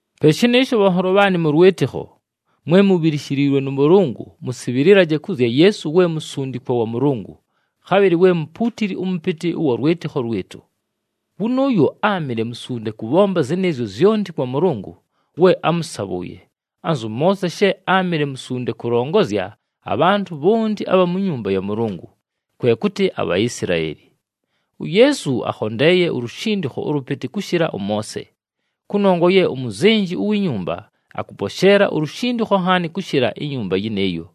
Pe shɨnɨɨsho, bhanholo bhaanɨ mʉ lwɨtɨkho, mwe mubhilishiliilwe nʉ Mʉlʉngʉ, mʉsɨbhɨlɨlaje kʉ zya Yeesu we musundikwa wa Mʉlʉngʉ, khabhɨlɨ we mupuutili ʉmʉpɨtɨ ʉwa lwɨtɨkho lwɨtʉ. Wʉnʉʉyo áamɨle musunde kʉbhomba zɨnɨɨzyo zyonti kwa Mʉlʉngʉ we ámʉsabhʉʉye, anzʉ Moose she áamɨle musunde kʉlongozya abhantʉ bhonti abha mu nyumba ya Mʉlʉngʉ, kwe kʉtɨ aBhaisilaeli. UYeesu akhondeeye ulushindikho ʉlʉpɨtɨ kʉshɨla ʉMoose, kʉnongwa ye umuzenji uwi nyumba akʉposheela ulushindikho nhaani kʉshɨla inyumba yɨnɨɨyo.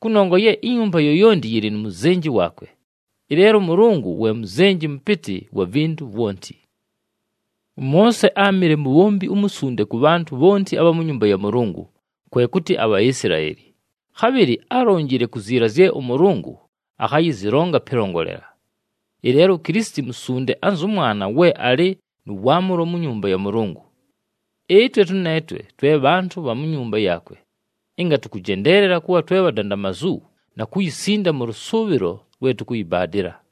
Kʉnongwa ye inyumba yoyonti yɨlɨ nu muzenji waakwe, ɨleelo ʉMʉlʉngʉ we Muzenji Mʉpɨtɨ wa vintu vwonti. ɄMoose áamɨle mubhombi umusunde kʉ bhantʉ bhonti abha mu nyumba ya Mʉlʉngʉ, kwe kʉtɨ aBhaisilaeli, khabhɨlɨ álonjile ku ziila zye ʉMʉlʉngʉ akhayɨzɨlonga pɨlongolela. Ɨleelo uKilisiti Musunde anzʉ Mwana we alɨ nʉ waamʉlo mu nyumba ya Mʉlʉngʉ. Ɨtwe tʉneetwe twe bhantʉ bha mu nyumba yaakwe, ɨnga tʉkʉjendeelela kʉbha twe bhadandamazu na kuyisinda mʉ lʉsʉʉbhɨlo lwe tʉkʉyɨbaadɨla.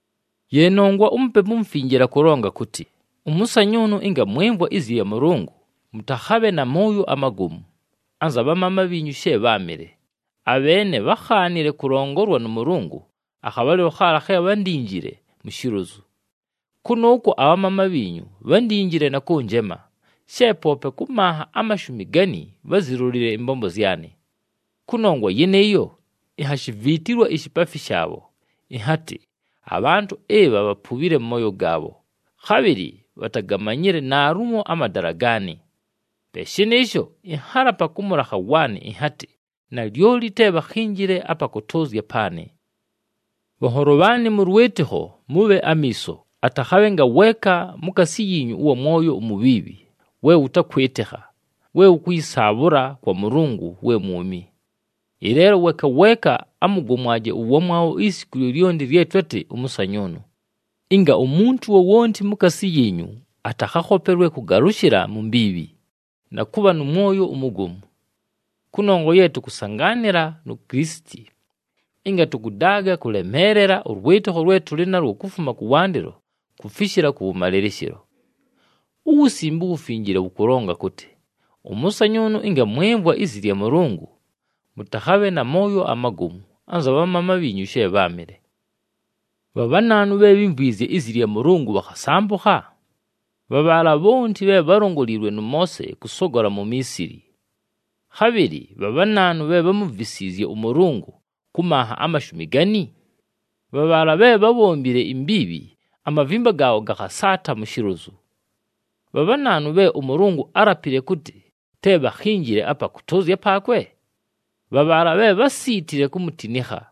Ye nongwa uMupepu uMufinjile akʉlonga kʉtɨ, “Ʉmʉsanyʉʉnʉ, ɨnga mwɨmvwa izi lya Mʉlʉngʉ, mʉtakhabhe na mooyo amagomu anza bhamaama bhiinyu she bháamɨle. Abheene bhákhaanile kʉlongolwa nʉ Mʉlʉngʉ, akhabhalɨlo khaala khe bhándinjile mu shilozu. Kʉnʉʉkwo abhamaama bhiinyu bhándinjile na kʉnjema, she poope kʉ manha amashumi gani bházilolile ɨmbombo zyanɨ. Kʉnongwa yɨnɨɨyo, inhashiviitilwa ishipaafi shaabho, ɨnhatɨ, ‘Abhantʉ ɨbha bhapubhile mʉ mooyo gaabho, khabhɨlɨ bhatagamanyile naalumo amadala gaanɨ.’ Pe shɨnɨɨsho, ɨnhalapa kʉ mʉlakha waanɨ, ɨnhatɨ, ‘Nalyoli te bhakhinjile apa kʉtʉʉzya paanɨ.’” Bhanholo bhaanɨ mʉ lwɨtɨkho, mʉbhe amiiso, atakhabhe ngaweeka mukaasi yiinyu ʉwa mwoyo umubhiibhi we wʉtakwɨtɨkha, we wʉkʉyɨsaabhʉla kwa Mʉlʉngʉ we mwumi. Ɨleelo weeka weeka amʉgomwaje ʉwamwabho isiku lyolyonti lye twatɨ ʉmʉsanyʉʉnʉ, ɨnga umuntu wowonti mukaasi yiinyu atakhakhopelwe kʉgalʉshɨla mu mbiibhi, na kʉbha nʉ mwoyo umugomu. Kʉnongwa ye tʉkʉsangaanɨla nu Kilisiti, ɨnga tʉkʉdaaga kʉlemeelela ʉlwɨtɨkho lwe tʉlɨ nalwo kufuma kʉwandɨlo kufishila kʉwʉmalɨlɨshɨlo. UWusimbe uWufinjile wʉkʉlonga kʉtɨ, “Ʉmʉsanyʉʉnʉ, ɨnga mwɨmvwa izi lya Mʉlʉngʉ, mʉtakhabhe na mooyo amagomu, anza bhamaama bhiinyu she bháamɨle.” Bha bhanaanu bhe bhímvwizye izi lya Mʉlʉngʉ bhakhasambʉkha? Bha bhaala bhonti bhe bhálongoliilwe nʉ Moose kʉsogola mu Miisili. Khabhɨlɨ bha bhanaanu bhe bhámuvisiizye ʉMʉlʉngʉ kʉ manha amashumi gani? Bha bhaala bhe bhábhombile imbiibhi, amavimba gaabho gakhasaata mu shilozu. Bha bhanaanu bhe ʉMʉlʉngʉ álapile kʉtɨ te bhakhinjile apa kʉtʉʉzya paakwe? Bha bhaala bhe bhásiitile kumutinikha.